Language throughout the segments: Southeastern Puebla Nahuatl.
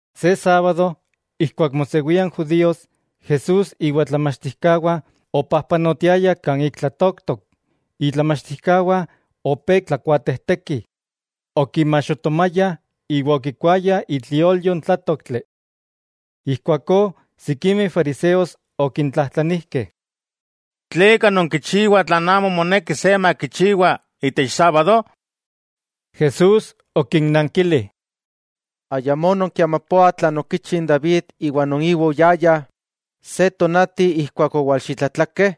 Se sábado ijkuak mosewia n judíos, Jesús iwa itlamachtijkawah opajpanotiayah kan ik tlatooktok, itlamachtijkawah opé tlakuatejtekih, okimaxotomayah iwa okikuayah itliolyo n tlátoktli. Ijkuakó sikimeh fariseos okintlajtlanijkeh: —¿Tleka nonkichiwah tlan amo moneki se makichiwa itech sábado? Jesús okinnankili: —¿Ayamó nonkiamapoah tlan okichi n David iwa non iwa oyayah, se tonati ijkuak owalxitlatlakeh?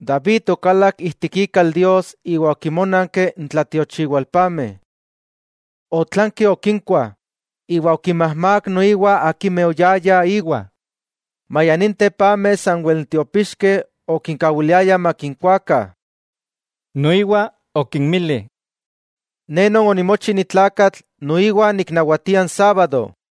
David okalak ijtik ikal Dios iwa okinmónanki n tlatiochiwalpameh. Otlanki okinkuah, iwa okinmajmák noiwa akimeh oyayah íwa, maya ninteh pameh sanwel n tiopixkeh okinkawiliayah makinkuakah. Noiwa okinmili: —Ne Non onimochi ni tlakatl noiwa niknawatia n sábado.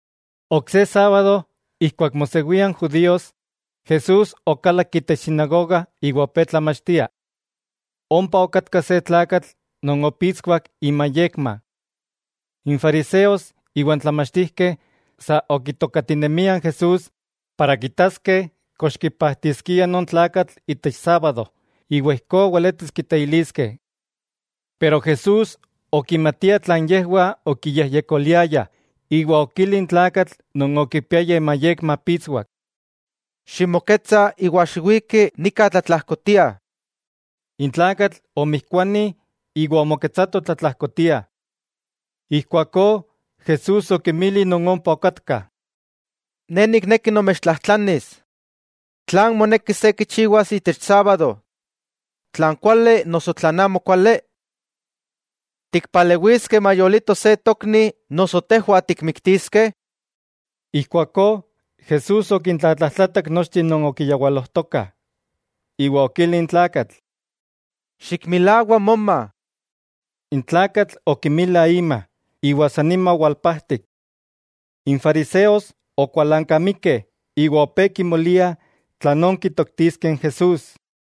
Ok se sábado ijkuak mosewia n judíos, Jesús okalak itech sinagoga iwa opé tlamachtia. Ompa okatka se tlakatl non opitswak imayekma. N fariseos iwa n tlamachtijkeh, sa okitokatinemiah n Jesús para kitaskeh kox kipajtiskia non tlakatl itech sábado iwa ijkó weletis kiteiliskeh. Pero Jesús okimatia tlan yejwah okiyejyekoliayah, iwa okili n tlakatl non okipiaya imayekma pitswak: —Ximoketsa iwa xiwiki nika tlatlajkotia. N tlakatl omijkuani iwa omoketsato tlatlajkotia. Ijkuakó Jesús okinmili non ompa okatkah: —Ne nikneki nomechtlajtlanis: ¿Tlan moneki se kichiwas itech sábado, tlan kuali noso tlan amokuali? ¿Tikpalewiskeh mayolito se tokni, noso tejwah tikmiktiskeh? Ijkuakó Jesús okintlatlajtlatak nochteh non okiyawalojtokah, iwa okili n tlakatl: —Xikmilawa moma. N tlakatl okimila ima, iwa san nima owalpajtik. N fariseos okualankamikeh, iwa opé kimoliah tlanón kitoktiskeh n Jesús.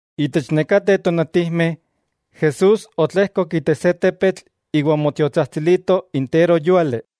Itech nekateh tonatijmeh, Jesús otlejkok itech se tepetl iwa omotiotsajtsilito interojyúali.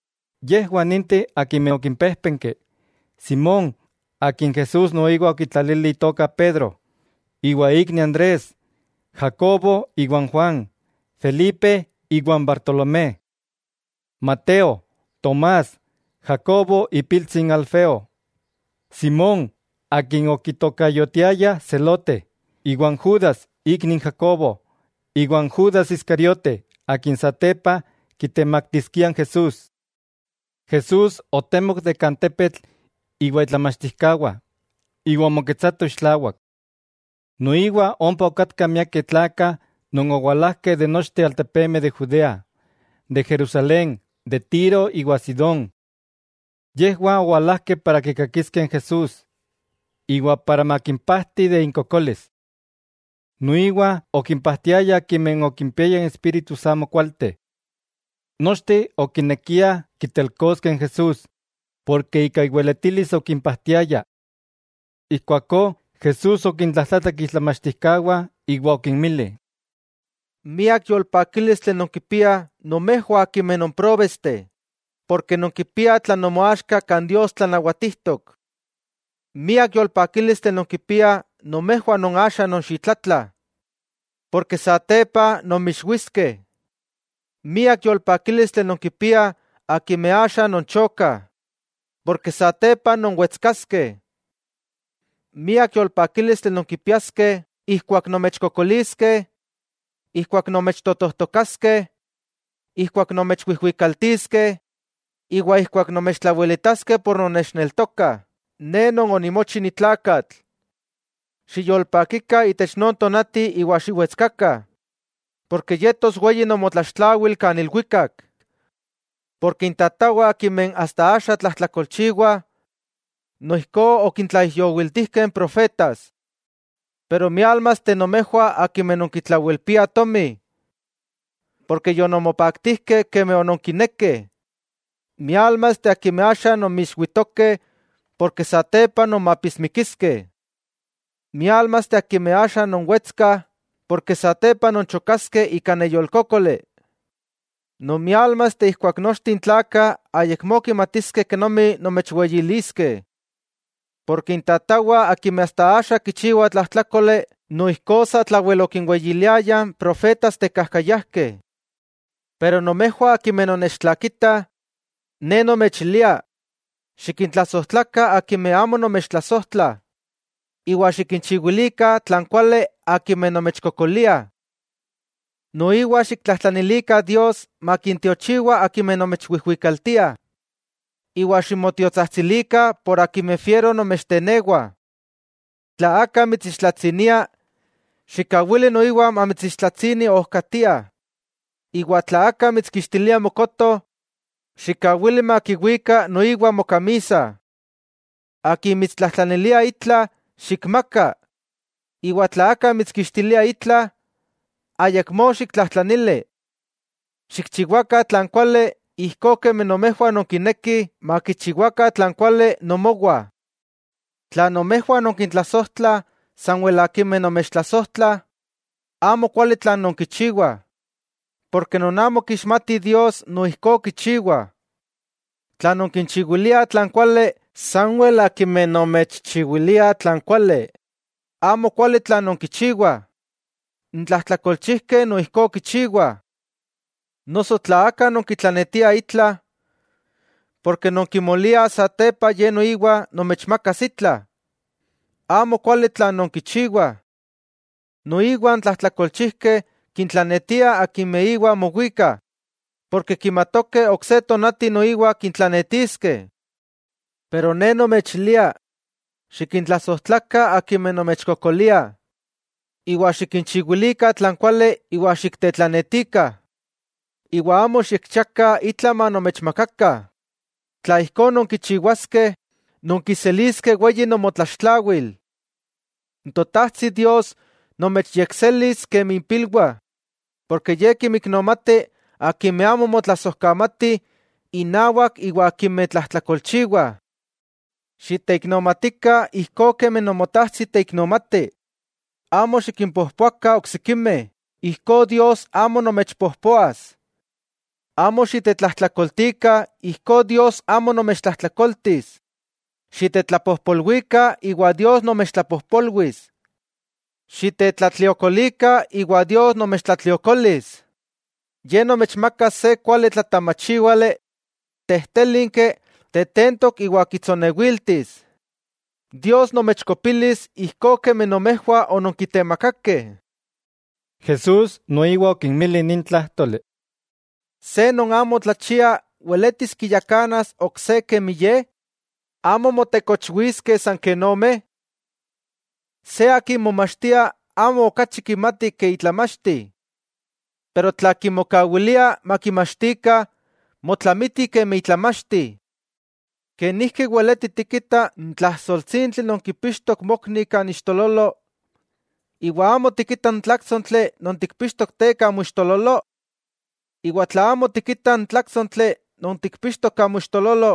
Yejwah ninteh akimeh okimpéjpenki: Simón, akin Jesús noiwa okitlalili itoka Pedro, iwa ikni Andrés; Jacobo iwa n Juan; Felipe iwa n Bartolomé, Mateo, Tomás, Jacobo ipiltsi n Alfeo; Simón akin okitokayotiayah Zelote, iwa n Judas ikni n Jacobo; iwa n Judas Iscariote, akin satepa kitemaktiskia n Jesús. Jesús otemok itech tepetl iwa itlamachtijkawah, iwa omoketsatoh ixtlawak. Noiwa ompa okatkah miakeh tlakah non owalajkeh de nochteh n altepemeh de Judea, de Jerusalén, de Tiro, iwa Sidón. Yejwah owalajkeh okikakikoh n Jesús iwa para makimpajti de inkokolis. Noiwa okimpajtiaya akimeh okimpiayah espíritus amokualteh. Nochteh okinekiah kitelkoskeh n Jesús, porke ika iweletilis okimpajtiaya. Ijkuakó Jesús okintlajtlatak itlamachtijkawah iwa okinmili: —Miak yolpakílistli nonkipiah nomejwah akimeh non próbesteh, porke nonkipiah tlan nomoaxka kan Dios tlanawatijtok. 'Miak yolpakílistli nonkipiah nomejwah non axa nonxitlatlah, porke satepa nonmixwiskeh. 'Miak yolpakílistli nonkipiah akimeh axa nonchokah, porke satepa nonwetskaskeh. 'Miak yolpakílistli nonkipiaskeh ijkuak nomechkokoliskeh, ijkuak nomechtotojtokaskeh, ijkuak nomechwijwikaltiskeh iwa ijkuak nomechtlawelitaskeh por nonnechneltokah Ne Non onimochi ni tlakatl. Xiyolpakikah itech non tonati iwa xiwetskakah, porke yetos weyi nomotlaxtlawil kan ilwikak, porke intatawah akimeh asta axa tlajtlakolchiwah, noijkó okintlaijyowiltijkeh n profetas. 'Pero miálmasteh nomejwah akimeh nonkitlawelpiah tomi, porke yononmopaktijkeh kemi ononkinekeh. 'Miálmasteh akimeh axa nonmixwitokeh, porke satepa nonmapismikiskeh. 'Miálmasteh akimeh axa nonwetskah porke satepa nonchokaskeh ika neyolkókoli. 'Non miálmasteh ijkuak nochteh n tlakah ayakmó kimatiskeh kenomi nomechweyiliskeh. Porke intatawah akimeh asta axa kichiwah tlajtlákoli noijkó satlawel okinweyiliayah n profetas tekajkayajkeh. 'Pero nomejwah akimeh nonnechtlakitah, Ne nomechilia: Xikintlasojtlakah akimeh amo nomechtlasojtlah, iwa xikinchiwilikah tlan kuali akimeh nomechkokoliah. Noiwa xiktlajtlanilikah Dios makintiochiwa akimeh nomechwijwikaltiah, iwa ximotiotsajtsilikah por akimeh fiero nomechtenewah. Tla aka mitsixtlatsinia, xikkawili noiwa mamitsixtlatsini ojkatia, iwa tla aka mitskixtilia mokoto, xikkawili makiwika noiwa mokamisa. Akin mitstlajtlanilia itla, xikmaka, iwa tla aka mitskixtilia itla, ayakmó xiktlajtlanili. Xikchiwakah tlan kuali, ijkó kemi nomejwah nonkinekih makichiwakah tlan kuali nomowah. 'Tla nomejwah nonkintlasojtlah sanwel akimeh nomechtlasojtlah, amo kuali tlan nonkichiwah. Porke non amo kixmatih Dios noijkó kichiwah. Tla nonkinchiwiliah tlan kuali sanwel akimeh nomechchiwiliah tlan kuali, amo kuali tlan nonkichiwah. N tlajtlakolchijkeh noijkó kichiwah. Noso tla aka nonkitlanetiah itla, porke non kimoliah satepa ye noiwa nomechmakas itla, amo kuali tlan nonkichiwah. Noiwa n tlajtlakolchijkeh kintlanetiah akimeh iwa mowikah, porke kimatokeh ok se tonati noiwa kintlanetiskeh. Ne nomechilia: Xikintlasojtlakah akimeh nomechkokoliah, iwa xikinchiwilikah tlan kuali iwa xiktetlanetikah. Iwa amo xikchiakah itla manomechmakakah. Tla ijkó nonkichiwaskeh, nonkiseliskeh weyi nomotlaxtlawil. N Totajtsi Dios nomechyekselis kemi ipilwah, porke Ye kinmiknomati akimeh amo motlasojkamatih innawak iwa akimeh tlajtlakolchiwah. Xiteiknomatikah ijkó kemi Nomotajtsi teiknomati. 'Amo xikimpojpoakah oksikimeh, ijkó Dios amo nomechpojpoas. Amo xitetlajtlakoltikah ijkó Dios amo nomechtlajtlakoltis. Xitetlapojpolwikah iwa Dios nomechtlapojpolwis. Xitetlatliokolikah iwa Dios nomechtlatliokolis. Ye nomechmakas se kuali tlatamachíwale, tejtélinki, tetentok iwa kitsonewiltis. Dios nomechkopilis ijkó kemi nomejwah ononkitemakakeh. Jesús noiwa okinmili nin tlájtoli: —¿Se non amo tlachia weletis kiyakanas ok se kemi ye? ¿Amo motekochwiskeh san ken omeh? Se akin momachtia amo okachi kimati ke itlamachti. Pero tla kimokawilia makimachtikah, motlamiti kemi itlamachti. '¿Kenijki weleti tikita n tlajsoltsintli non kipixtok mokni kan ixtololo, iwa amo tikita n tláktsontli non tikpixtok te kan moixtololo? Iwa tla amo tikita n tláktsontli non tikpixtok kan moixtololo,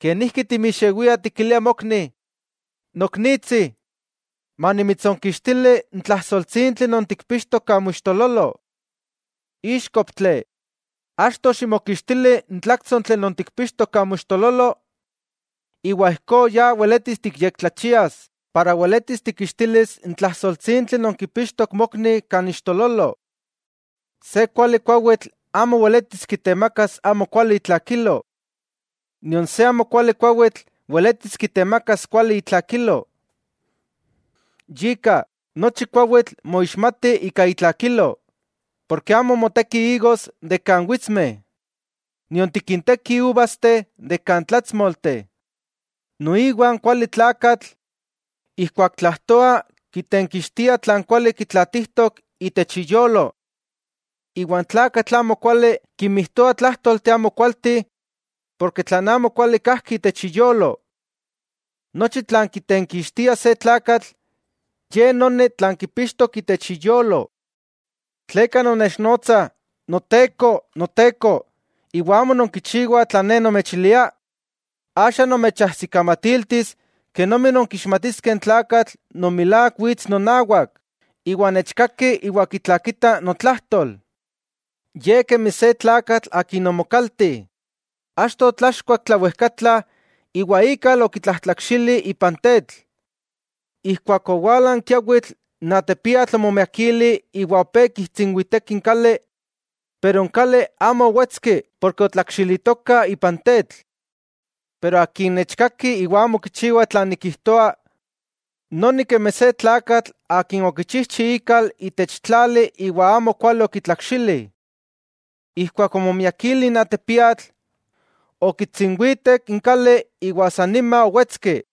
¿kenijki timixewia tikilia mokni: “Noknitsi, manimitsonkixtili n tlajsoltsintli non tikpixtok kan moixtololo”? ¡Íxkoptli!, achto xikmokixtili n tláktsontli non tikpixtok kan moixtololo, iwa ijkó ya weletis tiyektlachias para weletis tikixtilis n tlajsoltsintli non kipixtok mokni kan iixtololo. 'Se kuali kuawitl, amo weletis kitemakas amokuali itlakilo. Nion se amokuali kuawitl weletis kitemakas kuali itlakilo. Yika, nochi kuawitl moixmati ika itlakilo, porke amo motekih igos de kan witsmeh, nion tikintekih uvasteh de kan tlatsmolteh. Noiwa n kuali tlakatl, ijkuak tlajtoa kitenkixtia tlan kuali kitlaatijtok itech iyolo. Iwa n tlakatl amokuali kinmijtoa tlájtolteh amokualteh porke tlan amokuali kajki itech iyolo. Nochi tlan kitenkixtia se tlakatl, ye noni tlan kipixtok itech iyolo. '¿Tleka nonnechnotsah, “Noteko, Noteko”, iwa amo nonkichiwah tlan Ne nomechilia? Axa nomechajsikamatiltis kenomi nonkixmatiskeh n tlakatl non milák wits nonawak, iwa nechkaki iwa kitlakita notlajtol. Ye kemi se tlakatl akin omokalti. Achto otlachkuak tlawejkatla iwa ikal okitlajtlakxili ipan tetl. Ijkuak owala n kiawitl, n atepiatl omomiakili iwa opé kitsinwiteki n kali, pero n kali amo owetski porke otlakxilitoka ipan tetl. Pero akin nechkaki iwa amo kichiwa tlan nikijtoa, noni kemi se tlakatl akin okichijchi ikal itech tlali iwa amo kuali okitlakxili. Ijkuak omomiakili n atepiatl, okitsinwitek n kali iwa san nima owetski.